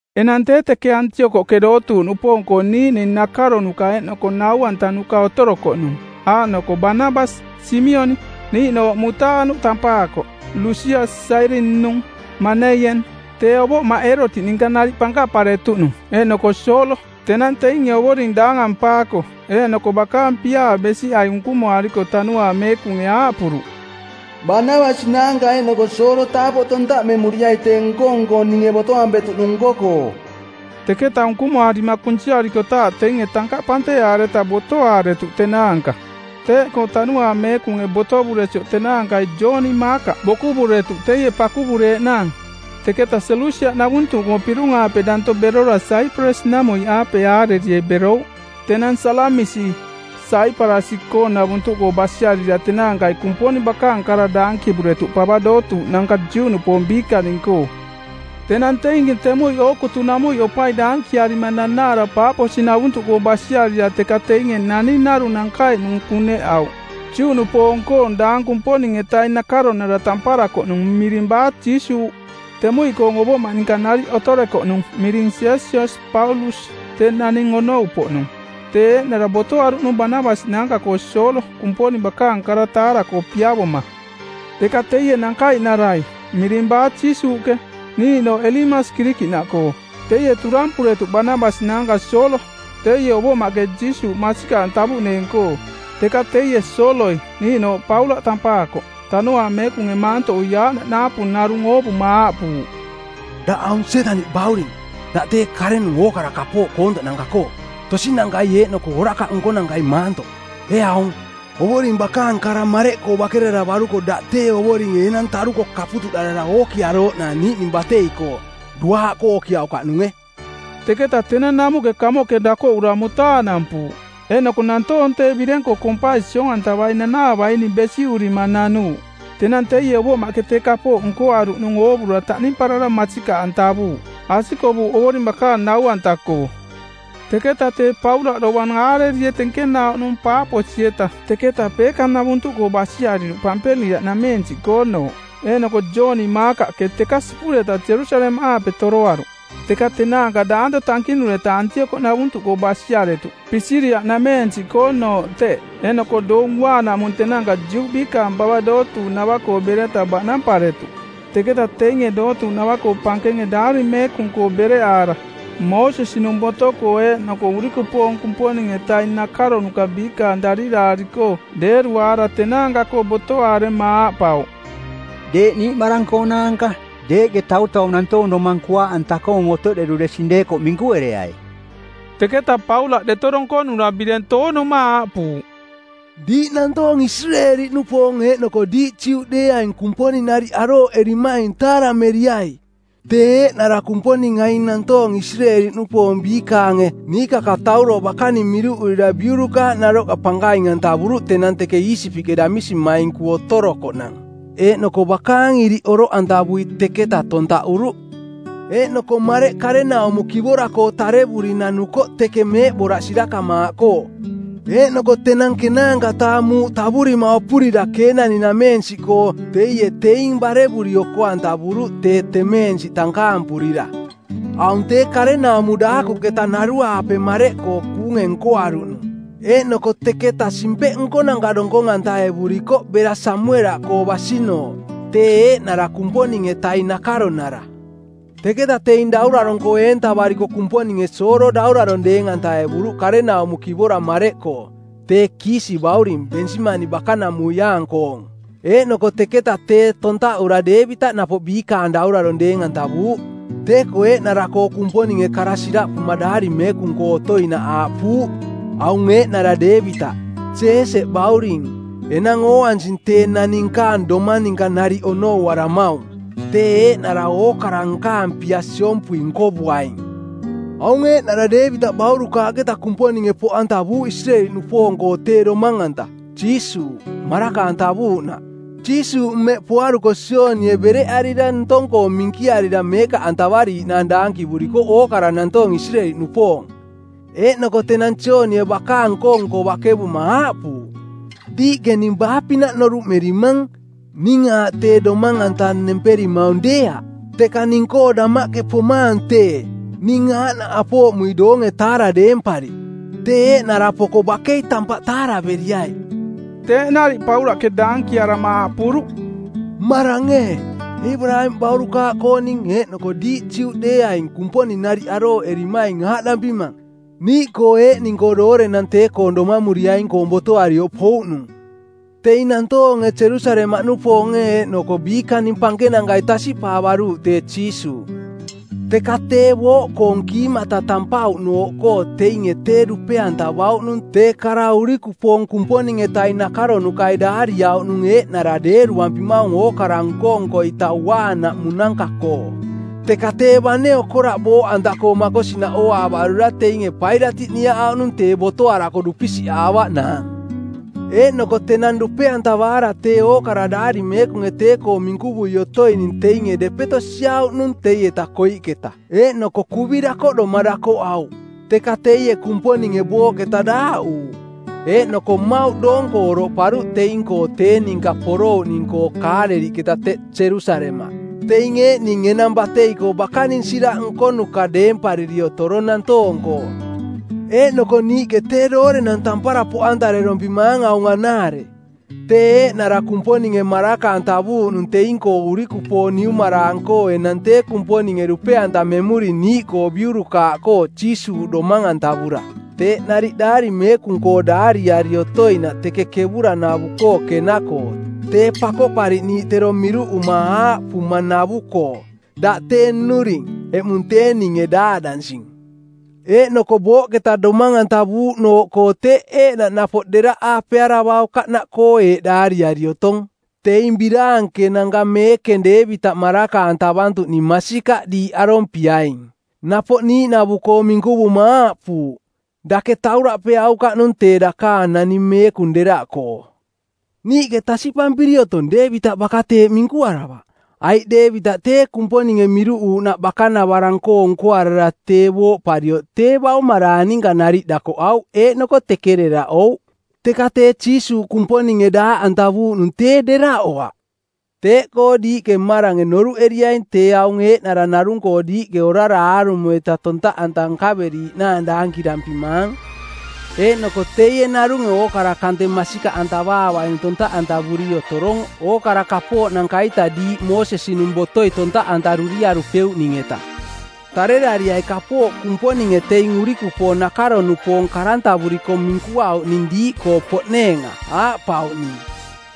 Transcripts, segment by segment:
Enang tee teke Antiokoꞌke dootuuꞌnupoong-koo niiꞌning nakaronuka eeꞌnoko nau-antanuka otorokoꞌnung, aaꞌnoko Banabasi, Simioniꞌ niiꞌnooꞌ Mutaanuꞌ tampaakoꞌ, Lusias Sairini-nung, Maneien, tee ovoꞌmaꞌ Eerotiꞌ ninka nariꞌ pankaꞌparetuꞌnung, eeꞌnoko Soolo. Tenang teinge Ovoring daangampaako eeꞌnoko bakaang piaa besiꞌai unkumoariko Tanuaang Meekunge aaꞌpuruꞌ, “Banabasi naanka eeꞌnoko Soolo taapoꞌ tontaꞌmemuriai tee nko-nko ninge botoampetuꞌnung nko-koo.” Teketa unkumoarima kunsiarikotaaꞌ teinge tankaꞌ panteꞌaareta botoaaretuꞌ tenaanka. Teeꞌkoo Tanuaang Meekunge botovuresioꞌ tenaankai Jooni Maakaꞌ bokuvuretuꞌ teie pakuvureeꞌnaang. Teketa Selusia-navuntuꞌkoo pirung-aape danto berora Saiparasi-namuiꞌaape aarerie˜ berouꞌ; Tenang Salamisi, Saiparasi-koonavuntuꞌkoo basiarira tenaankai Kumponing bakaang kara daankivuretuꞌ pava dootuuꞌnanka Juꞌnupoong biikaning-koo. Tenang teinge temuiꞌ ookutunamuiꞌ opai daankiaarima nanaara Paaposi-navuntuꞌkoo basiarira teka teinge naning narung nankaiꞌnung kuneꞌauꞌ, Juꞌnupoong-koong daang Kumponing-etaing nakaronara tamparakoꞌnung miring Baajiisuuꞌ. Temuiꞌkoong ovoꞌmaꞌ ninka nariꞌ otorekoꞌnung miring Sesias Paulus, tee naning onou-poꞌnung. Tee eeꞌnara botoaruꞌnung Banabasi naanka-koo Soolo Kumponing bakaang kara taara-koo piavoma. Teka teie nankaiꞌnarai, miring Baajiisuuꞌke, niiꞌnooꞌ Elimasi Kirikiꞌnaꞌkoo, teie turampuretuꞌ Banabasi naanka Soolo, teie ovoꞌmaꞌke Jiisuuꞌ masikaꞌantavuꞌneeng-koo. Teka teie, Sooloi, niiꞌnooꞌ Paulaꞌ tampaakoꞌ, Tanuaang Meekunge maantoꞌui aaꞌnaꞌ naapu narung oovuma aaꞌpuuꞌ, “Daꞌ aung Sietaniꞌ bauring, daꞌ tee karenung ookara kapooꞌ koontoꞌnanka-koo, tosinankai eeꞌnoko orakaꞌ nkonankai maantoꞌ. Ee aung, Ovoring bakaang kara mareꞌkoo bakeraravaruko daꞌ tee Ovoringe enang taruko kaputuꞌdarara ookiarooꞌnaang niiꞌning batei-koo; duaaꞌkoo ookiaukaꞌnunge.” Teketa tenang namuꞌke kamoꞌke dakoꞌura mutaanampuuꞌ. Eeꞌnoko nantoong tee bireng-koo kompai siong-antavai nanaavaining besiꞌurima nanuuꞌ. Tenang teie ovoꞌmaꞌke tee kapooꞌ nkoaruꞌnung oovura taꞌnimparara masikaꞌantavuuꞌ. Asikovuuꞌ Ovoring bakaang nau-anta-koo. Teketa tee Paulaꞌ dovang aarerie tenkenauꞌnung Paaposi-eta teketa Peeka-navuntuꞌkoo basiariruꞌ Pampiliaꞌnameensiꞌkoonooꞌ. Eeꞌnoko Jooni Maakaꞌke teka sipureta Jerusalemaꞌaape toroaruꞌ. Teka tenaanka daanto tankinureta Antiokoꞌnavuntuꞌkoo basiaretuꞌ, Pisiria-nameensiꞌkoonooꞌ teꞌ. Eeꞌnoko Doong Uaanaꞌmung tenaanka Juꞌ biikaang pava dootuuꞌnava-koo bereta baꞌnamparetuꞌ. Teketa teinge dootuuꞌnava-koo pankenge Daari Meekung-koo bereꞌaara Moosesi-nung boto-koo eeꞌnoko urikupoong Kumponing-etaing nakaronuka biikaang dariraari-koo deeruaara tenaanka-koo botoarema aaꞌpauꞌ, “Deeꞌ niiꞌmarang-koonaanka, deeꞌke tautau nantoong domang kuaaꞌanta-koong otoꞌderuresing deekoꞌ minkuereai.” Teketa Paulaꞌ deto donkonura bireng toonuma aaꞌpuuꞌ, “Diiꞌ nantoong Isireeli-nupoong eeꞌnoko diiꞌ Juꞌdeeaing Kumponing nariꞌ arooꞌerimaing taarameriai. Tee eeꞌnara Kumponing aing nantoong Isireeli-nupoong biikaange niikakatauro bakaning miruꞌurira biurukaaꞌ naroꞌka pankaing-antavuruꞌ tenang teke Iisipiꞌke damisimainku otorokoꞌnang, eeꞌnoko bakaang iriꞌ oroꞌantavui teketaꞌ tontaꞌuruꞌ. Eeꞌnoko mareꞌ karenaumo kivora-koo tarevuri nanukoꞌ teke meeꞌboraꞌ sirakamaaꞌkoo. Eeꞌnoko tenang ˜kenaanka-taa muuꞌ tavurima opurira Keenani-nameensiꞌkoo teie teing barevuri oko-antavuruꞌ tee temeensiꞌ tankaampurira. Aung tee karenaumo daakuꞌketa naruaape mareꞌkoo kuunge nkoaruꞌnung. Eeꞌnoko teketa simpeꞌ nkonanka˜ donkong-antaevurikoꞌ bera Samuelaꞌkoo basinooꞌ, tee eeꞌnara Kumponing-etaing nakaronara. “Teketa teing daurarong-koo eentavariko Kumponinge Soolo daurarong deeng-antaevuruꞌ karenaumo kivora mareꞌkoo, tee Kiisi bauring, Bensimani bakanamuiaang-koong. Eeꞌnoko teketa tee tontaꞌura Deevitaꞌ napoꞌ biikaang daurarong deeng-antavuuꞌ. Tee-koo eeꞌnara-koo Kumponinge kara siraꞌpuma Daari Meekung-koo otoinaꞌ aaꞌpuuꞌ, ‘Aung eeꞌnara Deevitaꞌ, Jeeseꞌ bauring, enang ooansing tee naning nkaang domang ninka nariꞌ onouaramaung. Tee eeꞌnara ookara nkaang pia siompui nkovuaing.’ “Aung eeꞌnara Deevitaꞌ baurukaaꞌketa Kumponinge poꞌantavuuꞌ Isireeli-nupoong-koo tee Domang-anta, Jiisuuꞌ, maraka-antavuuꞌnaꞌ. Jiisuuꞌ mmeꞌ poaruko Joonie bereꞌarira ntong-koo minkiarira meekaꞌantavariiꞌnaang daankivurikoꞌ ookara nantoong Isireeli-nupoong. Eeꞌnoko tenang Joonie bakaang nko-nko bakevuma aaꞌpuuꞌ, ‘Diiꞌke ning baa-pinaꞌ noruꞌmerimang? Ning aaꞌ tee Domang-anta nemperimaung deeaꞌ, teka ning-koo damaꞌke pomaang tee, ning aaꞌnaꞌ apooꞌmui doonge-taara˜ deempari. Tee eeꞌnara poko bakei tampaꞌ taaraveriai.’” Teeꞌ nariꞌ Paulaꞌke daankiarama aaꞌpuruꞌ, “Mmarang ee, Eebaraamiꞌ baurukaaꞌkooning, eeꞌnoko diiꞌ Juꞌdeeaing Kumponing nariꞌ arooꞌerimaing aaꞌdampimang: Niiꞌkoo eeꞌning-koo doorenang tee-koong domamuriaing-koong botoarioꞌ pouꞌnung. Teing nantoonge Jerusalemaꞌnupoonge eeꞌnoko biikaning pankenankai tasiꞌpaavaruuꞌ tee Jiisuuꞌ, teka tee booꞌkoong kiimata tampauꞌnooꞌkoo teinge tee dupe-antavauꞌnung tee kara urikupoong Kumponing-etaing nakaronukai daariauꞌnung eeꞌnara deeruampimaung ookara nko-nko-ita uaanaꞌmunanka-koo. Teka tee bane okoraꞌ booꞌanta-koo makosinaꞌ ooaavarura teinge Pailatiꞌ niaꞌauꞌnung tee botoarako dupisiꞌaavaꞌnaang. Eeꞌnoko tenang dupe-antavaara tee ookara Daari Meekunge tee-koo minkuvui otoining teinge depeto siauꞌnung teieta koiꞌketa eeꞌnoko kuvi dakoꞌdoma dakoꞌauꞌ. Teka teie Kumponinge booꞌketa daaꞌuuꞌ. Eeꞌnoko mmauꞌ doong-koo oroꞌparuꞌ teing-koo tee ninka porouꞌning-koo Kaaleliꞌketa teꞌ Jerusalemaꞌ. Teing eeꞌning enang batei-koo bakaning siraꞌ nkonuka deempariri otorong nantoong-koo. “Eeꞌnoko niiꞌke tee doorenang tampara poꞌantarerorompimaang aung anaare: Tee eeꞌnara Kumponinge maraka-antavuuꞌnung teing-koo urikupoong niumaraang-koo enang tee Kumponinge dupe-antamemuring niiꞌkoo biurukaaꞌkoo Jiisuuꞌ domang-antavura. Teeꞌ nariꞌ Daari Meekung-koo daariari otoinaꞌ teke kevuranavu-koo Kena-koo Tee Pakoꞌpariꞌniiꞌ tero miruꞌuma aaꞌpumanavu-koo: ‘Daꞌ tee Nnuring. Eꞌmung tee ninge daaꞌdansing.’ Eeꞌnoko booꞌketa domang-antavuuꞌnooꞌkoo teeꞌ eeꞌnaꞌ napoꞌ deraꞌ aapearavaukaꞌnaꞌkoo eeꞌ daariari otong, ‘Teing biraankenanka meekeng Deevitaꞌ maraka-antavantuꞌning masikaꞌ diiꞌ arompiaing.’ Napoꞌ niiꞌnavu-koo minkuvuma aaꞌpuuꞌ: ‘Dake tauraꞌpeaukaꞌnung tee dakaang naning meekung deraꞌkoo.’ “Niiꞌke tasiꞌpampiri otong Deevitaꞌ baka teeꞌ minkuaravaꞌ, aiꞌ Deevitaꞌ tee Kumponinge miruꞌuuꞌnaꞌ bakanavarang-koo nkoarara tee booꞌparioꞌ tee baumaraang ninka nariꞌ dakoꞌauꞌ eeꞌnoko teke deraꞌouꞌ. Teka tee Jiisuuꞌ Kumponinge daaꞌantavuuꞌnung tee deraꞌoaꞌ. “Teeꞌkoo diiꞌke mmarange noruꞌeriaing tee aung eeꞌnara narung-koo diiꞌke orara aarumo-ita tontaꞌanta nkaveriaꞌnaang daankirampimaang. Eeꞌnoko teie narunge ookara kante masikaꞌantavaavaining tontaꞌantavuri otorong ookara kapooꞌnanka-ita diiꞌ Moosesi-nung botoi tontaꞌantaruriarupeuꞌning-eta. Tarerariai kapooꞌ Kumponinge teing urikupoong nakaro-nupoong karantavuriko minkuauꞌning diiꞌkoo poꞌneenga, aaꞌpauꞌning,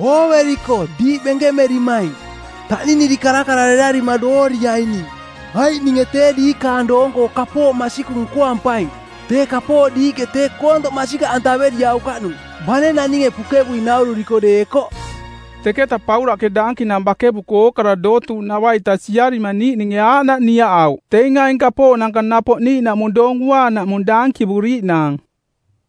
“Ooveriko diiꞌ benkemerimaing, taꞌniniri karakararerarima dooriaining, aiꞌ ninge tee diikaning doong-koo kapooꞌ masikung nkoampaing, tee kapooꞌ diiꞌke tee koontoꞌ masikaꞌantaveriaukaꞌnung bane naninge pukevui naururiko deekoꞌ.’” Teketa Paulaꞌke daankinang bakevuko ookara dootuuꞌnava-ita siarima niiꞌninge aaꞌnaꞌ niaꞌauꞌ teing aing kapooꞌnanka napoꞌ niiꞌnaꞌmung Doong Uaanaꞌmung dankivuriiꞌnaang.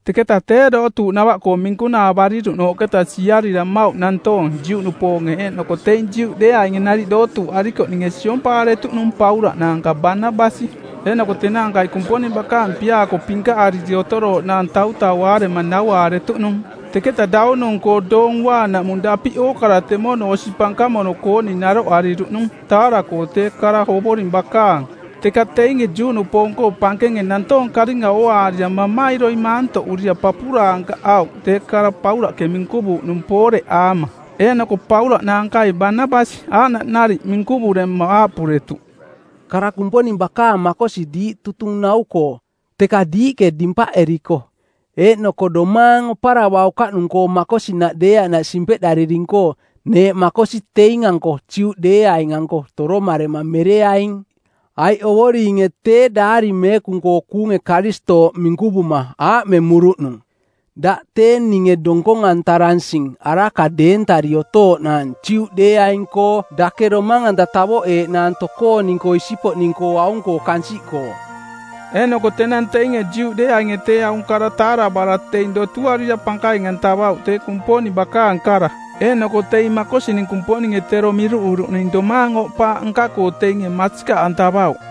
Teketa tee dootuuꞌnava-koo minkunaavariruꞌnooꞌketa siarira mmauꞌ nantoong Juꞌnupoonge eeꞌnoko teing Juꞌdeeaing nariꞌ dootuuꞌarikoꞌninge siompaaretuꞌnung Paulaꞌ naanka Banabasi. Eeꞌnoko tenaankai Kumponing bakaang piaa-koo pinkaꞌariri otorooꞌnaang tautauaarema nauaaretuꞌnung. Teketa daunung-koo Doong Uaanaꞌmung dapiꞌ ookara temono osi pankamono-kooning naroꞌariruꞌnung taara-koo tee kara Ovoring bakaang. Teka teinge Juꞌnupoong-koo pankenge nantoong karinga ooaarira mamairoi maantoꞌurira papuraankaꞌauꞌ tee kara Paulaꞌke minkuvuuꞌnung pooreꞌaama. Eeꞌnoko Paulaꞌ naankai Banabasi aaꞌnaꞌ nariꞌ minkuvurema aaꞌpuretuꞌ, “Kara Kumponing bakaang makosi diiꞌ tutung nau-koo, teka diiꞌke dimpaꞌering-koo eeꞌnoko domaang oparavaukaꞌnung-koo makosinaꞌ deeaꞌnaꞌ simpeꞌdariring-koo, neeꞌ makosi teing-anko Juꞌdeeaing-anko toromarema mereaing. Aiꞌ Ovoringe tee Daari Meekung-koo kuunge Karistooꞌ minkuvuma aaꞌmemuruꞌnung, ‘Daꞌ tee ninge donkong-antaransing araka deentari otooꞌnaang Juꞌdeeaing-koo dake domang-anta tavoꞌeeꞌnaang tokooning-koo isipoꞌning-koo aung-koo kansiꞌkoo.’” Eeꞌnoko tenang teinge Juꞌdeeainge tee aung kara taaravaara teing dotuarira pankaing-antavauꞌ tee Kumponing bakaang kara, eeꞌnoko teing makosining Kumponinge tero miruꞌuruꞌning domaang oꞌpaaꞌ nka-koo teinge masikaꞌantavauꞌ.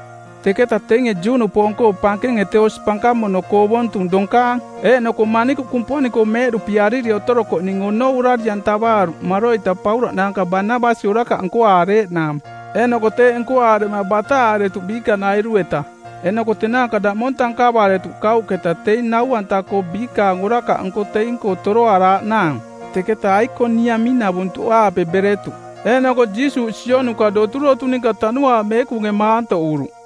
Teketa teinge Juꞌnupoong-koo pankenge tee osi pankamono-koo ovontung donkaang eeꞌnoko manikuꞌ Kumponing-koo meeꞌduꞌpiariri otorokoꞌning onou orari-antavaaruꞌ maroita Paulaꞌ naanka Banabasi orakaꞌ nkoaareeꞌnaang, eeꞌnoko teeꞌ nkoaarema bataꞌaaretuꞌ biikanairu-eta. Eeꞌnoko tenaanka daꞌmong tankavaretuꞌ kauꞌketa teing nau-anta-koo biikaang orakaꞌnko teing-koo toroaraaꞌnaang. Teketa Aikoniamiꞌnavuntuꞌaape beretuꞌ. Eeꞌnoko Jiisuuꞌ sionuka doturotu ninka Tanuaang Meekunge maantoꞌuruꞌ.